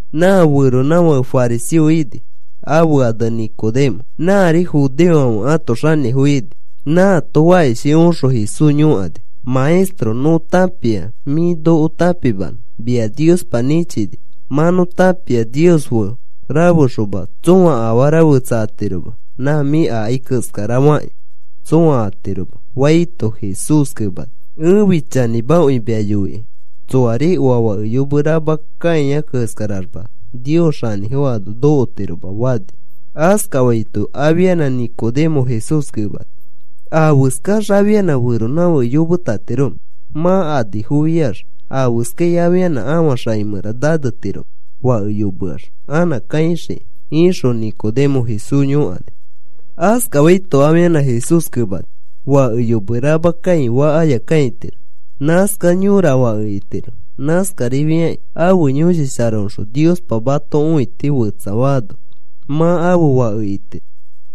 Nã feronãfake fariseo ini, ãfe ane Nicodemo. Nãri judeofãfe ãto xanĩfo ini. Nãato fakishi oxõ Jesús yõkani: “Maestro, nõ tãpia mĩ noko tãpimanõ mia Niospa nĩchini. Mã nõ tãpia Nios fe rafexoma tsõa afara fetsa atiroma nã mĩ akai keskara fakĩ tsõa atiroma,” faito, Jesús kemani: “Ẽfi chanĩmakõi mia yoikai. Tsoari oa fake yome rama kãia keskaraxma Nios xanĩfo ano nokotiroma,” fani. Askafaito afianã Nicodemo Jesús kemani: “¿Afeskax afianã feronãfake yometatiromẽ? ¿Mã anifofiax afeskai afianã ãfa xaki mẽra nanetiromẽ, fake yomeax anã kãixikĩ?” ixõ Nicodemo Jesús yõkani. Askafaito afianã Jesús kemani: “Fake yome rama kãi fakaya kãitiro. (Nãskax yõra fake itiro. Nãskariakĩ ãfe Yõshi Sharaõxõ Niospa mato õiti fetsafaano mã ãfe fake itiro.)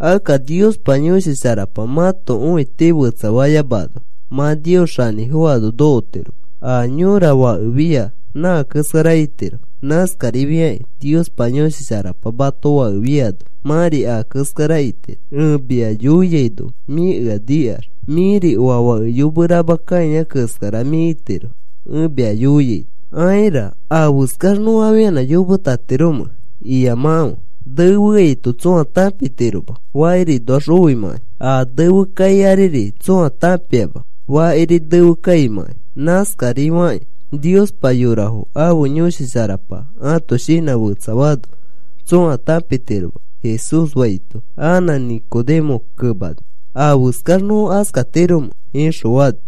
Akka Niospa Yõshi Sharapa mãto õiti fetsafayamano mã Nios xanĩfo ano nokotiroma. A yõra fake fia nã keskara itiro. Nãskarifiakĩ Niospa Yõshi Sharapa mato fake fiano mãri a keskara itiro. Ẽ mia yoiaino mĩ ea nikax, ‘Mĩri oa fake yome rama kãia keskara mĩ itiro,’ ẽ mia yoiano, ‘Aira, ¿afeskax nõ afianã yometatiromẽ?’ iyamafe. Nefeaito tsõa tãpitiroma fakirinoax oimãkai. A nefe kai ariri tsõa tãpiama fakiri nefe kaimãkai. Nãskari fakĩ Niospa yorafo ãfe Yõshi Sharapa ãto shinã fetsafaano tsõa tãpitiroma,” Jesús faito, anã Nicodemo kemani: “¿Afeskax nõ askatiromẽ?” ixõ fani.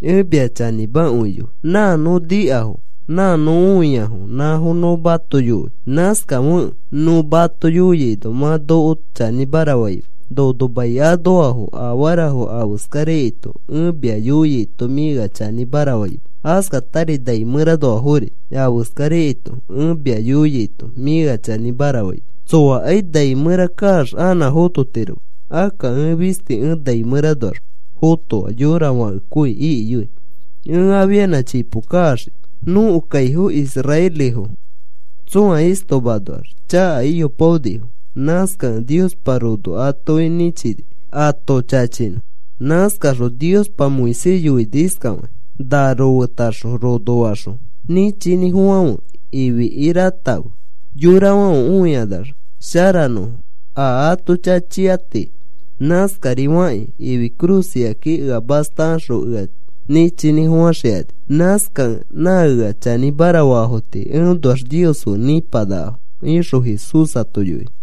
Ẽ mia chanĩmakõi yoi. Nã nõ nikafo nã nõ õiafo nãfo nõ mato yoi. Nãskafekẽ nõ mato yoiaino mã noko chanĩmara faima. Nono mai anoafo afarafo afeskaraito ẽ mia yoiaito mĩ ea chanĩmara faima. Askatari nai mẽranoafori afeskaraito ẽ mia yoiaito mĩ ea chanĩmara faima. “Tsoakai nai mẽra kaax anã fototiroma. Akka ẽ fisti ẽ nai mẽranoax fotoa yora fakekõi ikiyoi. Ẽ afianã chipo kaxii. (Nõko kaifo israelifo tsõa istomanoax chaka iyopaonifo. Nãskakẽ Niospa rono atoki nĩchini ato chachinõ. Nãskaxõ Niospa Moisés yoini iskafakĩ: ‘Na rofetaxõ rono faxõ nĩchinĩfofãfe ifiki ratãfe yorafãfe õikanax sharanõfo, a ato chachia tii.’) Nãskari fakĩ ifi cruz ikakĩ ea mastakaxõ ea nĩchinĩfofãxikani. Nãskakẽ nã ea chanĩmara faafo tii eõnoax Nios fe nipanakafo,” ixõ Jesús ato yoini.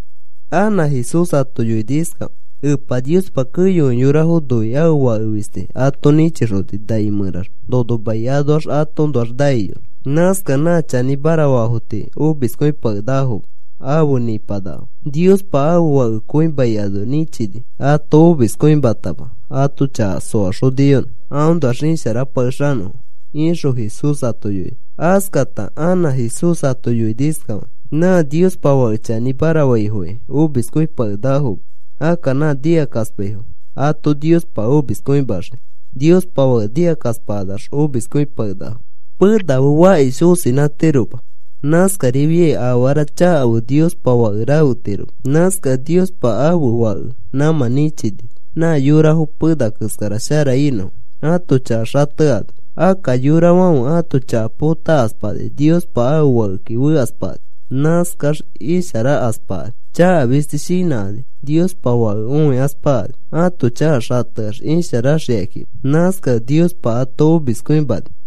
Anã Jesús ato yoini iskafakĩ: “Epa Niospa keyokõi yorafo noikĩ ãfe Fake fisti ato nĩchixoni nai mẽraxõ nono mai anoax atoõnoax naiyonõ. Nãskakẽ nã chanĩmara faafo tii omiskõipakenakafoma afe nĩpanakafo. Niospa ãfe Fakekõi mai ano nĩchini ato omiskõimatama ãto chaka soaxoniyonõ aõnoax isharapakexanõfo,” ixõ Jesús ato yoini. Askata anã Jesús ato yoini iskafakĩ: “Nã Niospa Fake chanĩmara faifokai omiskõipakenakafoma. Akka nã nikakaspaifo ato Niospa omiskõimaxii. Niospa Fake nikakaspakanax omiskõipakenakafo. Pena fe fakish osinãtiroma. Nãskarifiai afara chaka fe Niospa fake rafetiroma. Nãskakẽ Niospa ãfe fake nãmã nĩchini nã yorafo pena keskara shara inõfo ãto chaka xatekanax. Akka yorafãfe ãto chaka potakaspakani. Niospa ãfe fakeki fekaspakani. Nãskax isharakaspakani, chaka fisti shinãkani. Niospa fake õikaspakani ãto chaka xateax isharaxikakima. Nãskakẽ Niospa ato omiskõimani.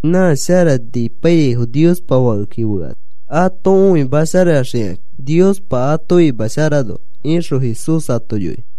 Nã shara nipaiyaifo Niospa Fakeki fekani. Ato õimasharaxikakĩ Niospa ato imasharanõ,” ixõ Jesús ato yoini.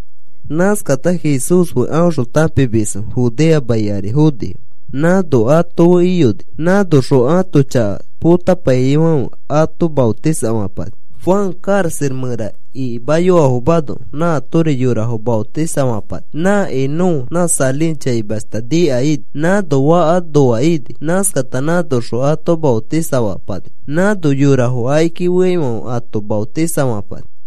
Nãskata Jesús fe aõxõ tãpimisfo Judea mai ari fonifo. Nãno ato fe iyoni. Nãnoxõ ãto chaka potapaiyaifãfe ato maotisafapani. Juan karaxa mẽra ikimayofafomano nãatori yorafo maotisafapani. Nã Enón nã Salim chaimashta nika ini. Nãno faka noa ini. Nãskata nãnoxõ ato maotisafapani. Nãno yorafo akiki feaifãfe ato maotisafapani.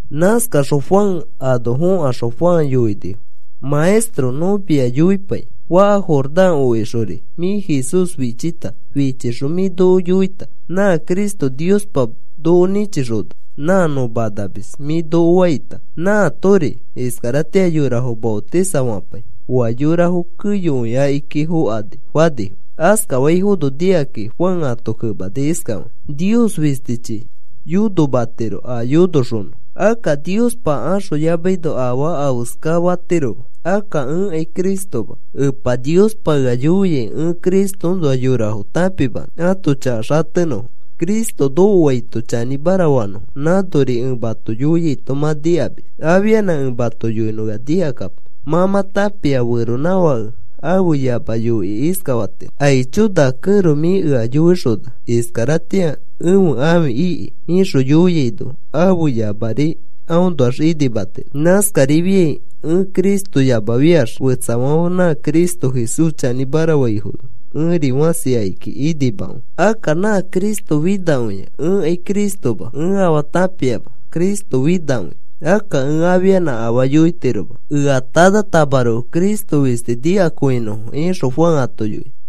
Nãskaxõ Juan ano fõkaxõ Juan yoinifo: “Maestro, nõ mia yoipai. Faka Jordán okixori mĩ Jesús fichita. Fichixõ mĩ noko yoita: ‘Nã Cristo Niospa noko nĩchixona nã nõ manamis,’ mĩ noko faita. Nãatori iskaratĩa yorafo maotisafapai. Oa yorafo keyokõi akiki fokani,” fanifo. Askafaifono nikakĩ Juan ato kemani iskafakĩ: “Nios fistichi yonomatiro a yonoxonõ. Akka Niospa axoyamaino afaa afeska fatiroma. Akka ẽkai Cristoma. Epa Niospa ea yoia ẽ Cristoõnoa yorafo tãpimanõ ãto chaka xatenõfo, Cristo nokoaito chanĩmara fanõfo. Nãnori ẽ mato yoiaito mã nikamis. Afianã ẽ mato yoinõ ea nikapo. Mã mã tãpia feronãfake ãfe yama yoikĩ iskafatiro: ‘Aicho. Na kẽro mĩ ea yoixona iskaratĩa ẽfe ãfi iki,’ ixõ yoiaino ãfe yamari aõnoax inimatiro. Nãskarifiai ẽ Cristoyamafiax fetsafãfe nã Cristo Jesús chanĩmara faifono ẽri fãsi akiki inimakõi. Akka nã Cristo finakõia. Ẽkai Cristoma. Ẽ afaa tãpiama, Cristo finakõia. Akka ẽ afianã afaa yoitiroma ea tanatamaroko, Cristo fisti nikakõinõfo,” ixõ Juan ato yoini.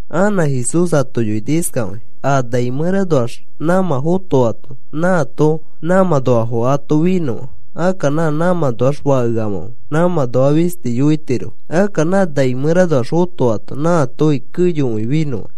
Anã Jesús ato yoini iskafakĩ: “A nai mẽranoax nãmã fotoato nãato nãmãnoafo ato finõa. Akka nã nãmãnoax fakeafãfe nãmãnoa fisti yoitirofo. Akka nã nai mẽranoax fotoato nãatofi keyokõi finõa.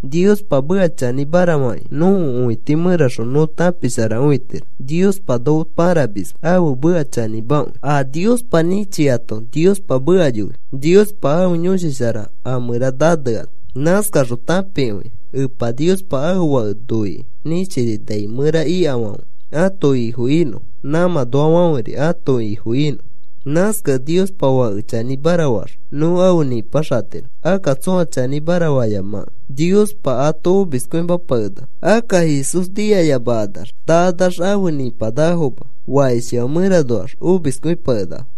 Niospa meka chanĩmara fakĩ nõko õiti mẽraxõ nõ tãpisharakõitiro Niospa noko pãramisma, ãfe meka chanĩmakõi. “A Niospa nĩchiato Niospa meka yoi Niospa ãfe Yõshi Shara a mẽra naneano. Nãskaxõ tãpikõia. Epa Niospa ãfe Fake noikĩ nĩchini nai mẽra ikafãfe ãto Ifo inõ, nãmãnoafãferi ãto Ifo inõ. Nãskakẽ Niospa Fake chanĩmara faax nõ afe nipaxatiro. Akka tsõa chanĩmara fayamakẽ Niospa ato omiskõimapakenaka. Akka Jesús nikayamakanax nakanax afe nĩpanakafoma fakishifã mẽranoax omiskõipakenakafo.”